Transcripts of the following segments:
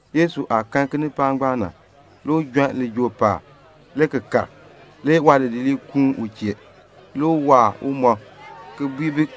Yesu aah kan kinipaak ngbaan na, le u jon lijool paab, le ki kal. Le waadidiliib kuun u chee. Le u waar umɔb ki bui bi: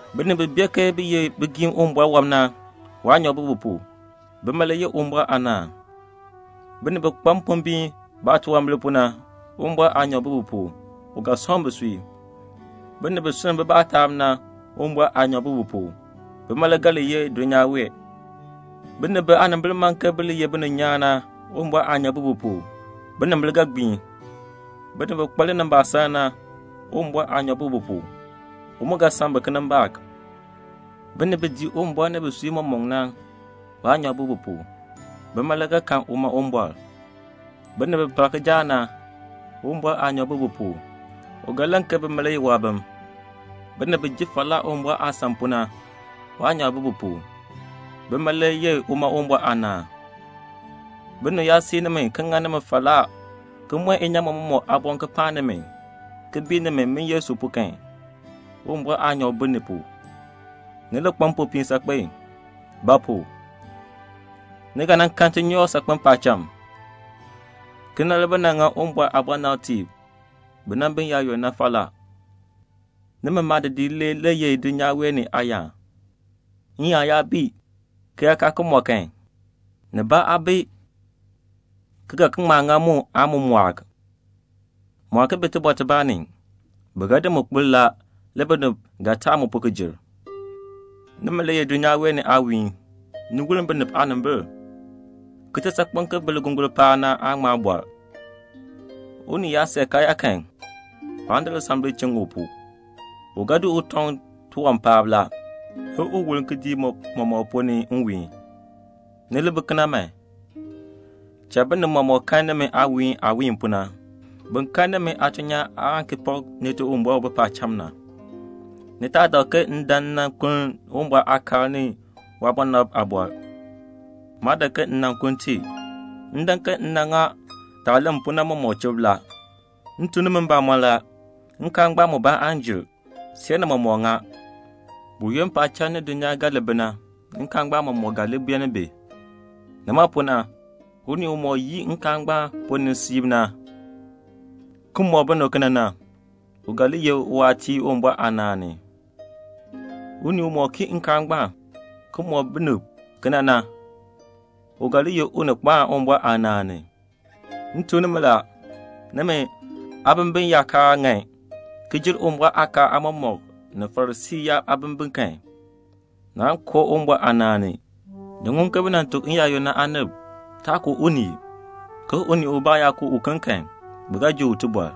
"Binib bi bee ke bi ye bigiim Uwumbɔr wɔb na, waanyoor bi bi pu. Bima le yeh Uwumbɔr aanaan. "Binib bi kpa mpombiin baatunwambir pu na, Uwumbɔr aanyoor bi bi pu; u ga sɔŋ bisui. "Binib bi sunn bibaa taab na, Uwumbɔr aanyoor bi bi pu. Bima le ga li yeh dulnyaa wee. "Binib biyaanimbil man ke bi li ye bininyaan na, Uwumbɔr aanyoor bi bi pu. Binimbil ga gbiin. "Binib bi kpa linimbaasaln na, Uwumbɔr aanyoor bi bi pu. U mu ga san bi kinimbaak. "Binib bi dii Uwumbɔr ni bisui mɔmɔk na, waanyoor bi bi pu. Bima le ga kan uma Uwumbɔr. "Binib bi par kijaak na, Uwumbɔr aanyoor bi bi pu. U ga len ke bi ye waabim. "Binib bi ji falaa Uwumbɔr aasan pu na, waanyoor bi bi pu. Bima le yeh uma Uwumbɔr aanaan. "Binib yaa sii nimi ki ŋa nimi falaa ki mɔn inyaamɔn mɔmɔk aaboŋ ki paan nimi, ki bii nimi, min Yesu pu kan, Uwumbɔr aanyoor bi ni pu. Ni li kpa mpopiin saakpen. Ba pu? ni ga kan tinyoor saakpen paacham. Kena le bi nan ŋa Uwumbɔr aabɔnabtiib bi nan bi n-yaayoonn na falaa." "Nimi maadidiliib le ye dulnyaa wee ni aayaan. N-yaan yaa bii, ki yaa kaa ki mɔ kan, nibaa aa bi ki ga ki ŋma ŋa mu aan mu mɔɔk. Mu aa ki bi tibɔr tibaa ni. Bi ga di kpir. Le binib ga taan mu pu ki jer. "Nimi le ye dulnyaa wee ni aawiihn, ni woln binib aanimbil. Kitisaakpeŋ ki bi ligongol paab na aan ŋma bɔr. Unii yaa see karyaa kan, waan di lisambil ki di chiŋ u pu. U ga di u tɔŋ tiwan paab la, le u woln kidiik mɔmɔk ponn ni nwiihn. Ni li bi kena man. Cha binib mɔmɔk kan nimi aawiihn aah wiin pu na, bin kan nimi aatuln nyaan aan ki pak Nite Uwumbɔr u bi paacham na." "Ni taa dak ke m dan m nan kuln Uwumbɔr aakaal ni Waabɔnabtiib aaliin. Maa dan ke m nan kuln i. M dan ke m nan ŋa yaah len pu na mɔmɔk chub. M tuk nimi mbamɔn la, nkaal ngbaan mubaa aan jer, see ni mɔmɔk ŋa. Buyoonn paacham ni dulnyaa ga li bi na, nkaal ngbaan mɔmɔk ga li beenin bi. Nima pu na, unii umɔk yii nkaal ngbaan ponn ni siib na, ki mɔk binib kena na, u ga li ye uwaatiir Uwumbɔr aanaan ni. Unii umɔk kii nkaal ngbaan, ki mɔk binib kena na, u ga li ye unikpaan Uwumbɔr aanaan ni. M tuk nimi la, nimi aabimbin yaa kaa ŋan ki jer Uwumbɔr aakaal aamɔmɔkb ni Farisii yaab aabimbin kan, naan koo ni Uwumbɔr aanaan ni." "Ni ŋun ke bi nan tuk n-yaayoonn na aanib, 'Taa ku unii, ke unii ubaa yaa ku uken kan, bi ga ji u tibɔr.'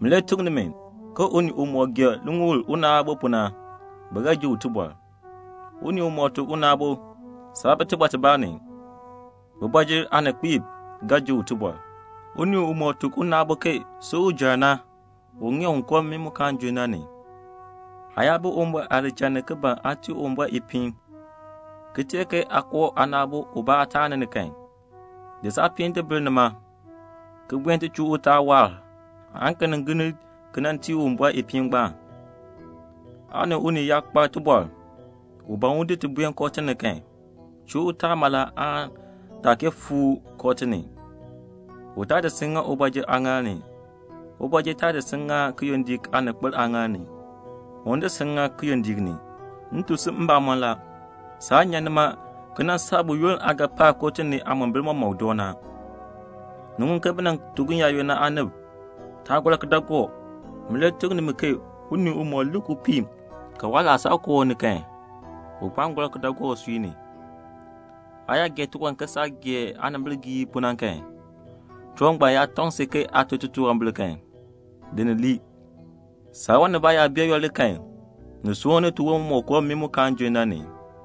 Min le tuk nimi ke unii umɔk gee liŋuul una aabo pu na, bi ga ji u tibɔr. Unii umɔk tuk una aabo, 'Saa bi tibɔr tibaa ni,' kooti ni aaninkpiib ga ji u tibɔr. Unii umɔk tuk una aabo, 'Si ujɔr,' u ŋeer un koo mmii mu kaan junn na ni. Aa yaa bi Uwumbɔr aadichal ni ki ban aa tii Uwumbɔr ipiin, ki teer ke aa koo aana aabo ubaa aataani ni kan, di saapiin di bil nima, ki buen ti chuu utaal waahr, aan ki nin gir ni ki nan tii Uwumbɔr ipiin ngbaan. "Aa ni unii yaa kpa tibɔr, u ban un di ti buen kooti ni kan, chuu utaal mala naa kee fuu kooti ni, u taa di si ki ŋa ubɔjir aaŋaal ni, ubɔjir taa di si ki ŋa kiyondiik aaninkpil aaŋaal ni, un di si ŋa kiyondiik ni. M tuk si mbamɔn la, saan nyan nima ki nan saa buyoonn aa ga pa kooti ni aamombil mɔmɔk na." "Ni ŋun ke bi nan tuk n-yaayoonn na aanib, 'Taa gɔr kidaagook'. Min le tuk nimi ke unii umɔk lik upii ka waalaasab koo u ni kan, u kpaan gɔr kidaagook usui ni. Aa yaa gee tiwan ke saah gee aanimbigiil pu na kan, tiwan ngbaan yaa tɔŋ si ke aa tun titunwambir kan, di ni lii. Saawan nibaa yaa bee yooli kan, ni soor ni tiwon mɔmɔk koo mmii mu kaan junn na ni.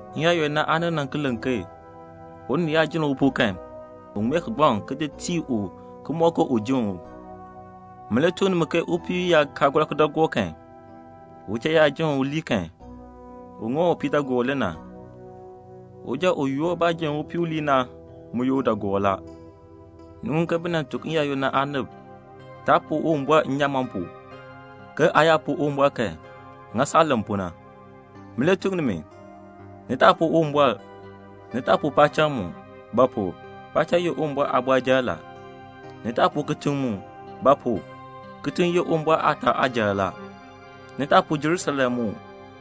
"N-yaayoonn na aanib nan ki len ke 'Unii yaa jenn upuu kan, un ŋmee kigbaŋ, ki di tii u ki mɔk ke u jenn u.' Min le tuk nimi ke upii yaa kaa gɔr kidaagook kan, uchal yaa jenn u lii kan, u ŋa u upiidaagoor le na. Uja u yoor baah jenn upii u ki lii na, u ye udaagoor la." "Ni ŋun ke bi nan tuk n-yaayoonn na aanib, 'Taa puu Uwumbɔr nnyaamɔn pu, ke aa yaa puu Uwumbɔr kan, ŋa saah len pu na.' Min le tuk nimi: ni taa puu Uwumbɔr. Ni taa puu paacham mu; ba pu? paacham ye Uwumbɔr aabɔrjal la. Ni taa puu dulnyaa mu; ba pu? dulnyaa ye Uwumbɔr aataa aajal la. Ni taa puu Jerusalem mu;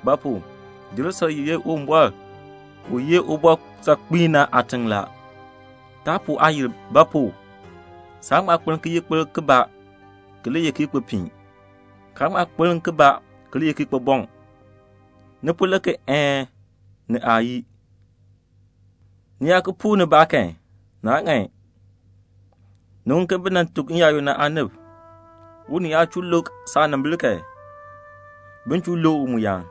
ba pu? Jerusalem ye Uwumbɔr u ye Ubɔr saakpiin na aatiŋ la. Taa puu aayil; ba pu? saan ŋma kpaln kiyikpilk kibaa, ki li ye kiyikpipiin, kaan ŋma kpaln kibaa ki li ye kiyikpibɔŋ. Ni po len ke 'Een' ni 'Aayii.' Ni yaa ki puu nibaa kan naa ŋan." "Ni ŋun ke bi nan tuk n-yaayoonn na aanib, 'Unii yaa chuu lukr saanimbil kan, bin chuu lukr u mu yaan.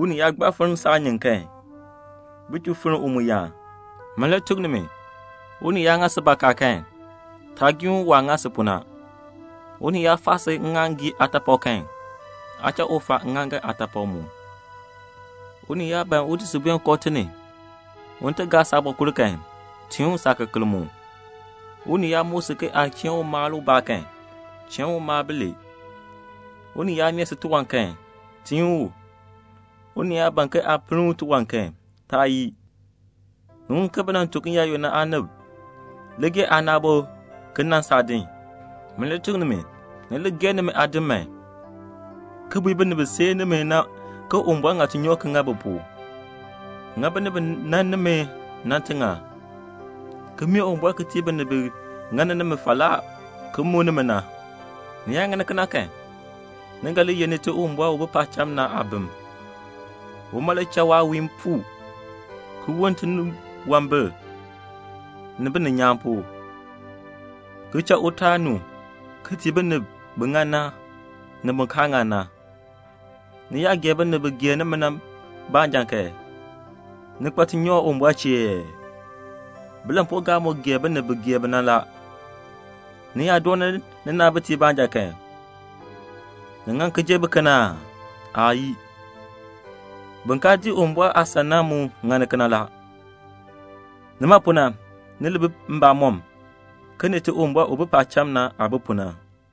Unii yaa gbaa nyan saanyin kan, bin chuu nyan u mu yaan.' Min le tuk nimi: unii yaa ŋa si bakaa kan, taa giin u waah ŋa si pu na. Unii yaa faa si aaŋaaŋgii aataapak kan, aa cha u faa aaŋaaŋgan aataapak mu. Unii yaa ban un di si buen kooti ni un ti gaa saabɔkul kan, tiin u saakekeln mu. Unii yaa muk si ke aa cheen u mal ubaa kan, cheen u mal bilee. Unii yaa mee si tiwan kan, tiin u. Unii yaa ban ke aa pinn u tiwan kan, taa yii." "Ni ŋun ke bi nan tuk n-yaayoonn na aanib, 'Li gee aana aabo ki nan saadin.' Min le tuk nimi: ni li gee nimi aadim man, ki bui binib bi sii nimi na ke Uwumbɔr ŋa tinyoor ki ŋa bi pu; ŋa binib bi nan nimi na tiŋann, ki mee Uwumbɔr ki tii binib bi ŋa nimi falaa ki muk nimi na. Ni yaa ŋa kena kan, ni ga li ye Nite Uwumbɔr u bi paacham na aabim; uma le cha waawiin puu ki woln tiniwambir ni bininyaan pu, ki cha utaal nu ki tii binib bi ŋan na, ni bin kaa ŋan na. Ni yaa gee binib bi gee nimi na baanja kan, ni kpa tinyoor Uwumbɔr chee ee? Bilampuugaab mu gee binib bi gee bi na la. Ni yaa dooni ninaabitiib baanja kan, ni ŋan ki jer biken aa? Aayii. Bin kaa dii Uwumbɔr aasan na mu ŋani kena la. Nima pu na, ni li bi mbamɔm, ke Nite Uwumbɔr u bi paacham na, aah bi pu na."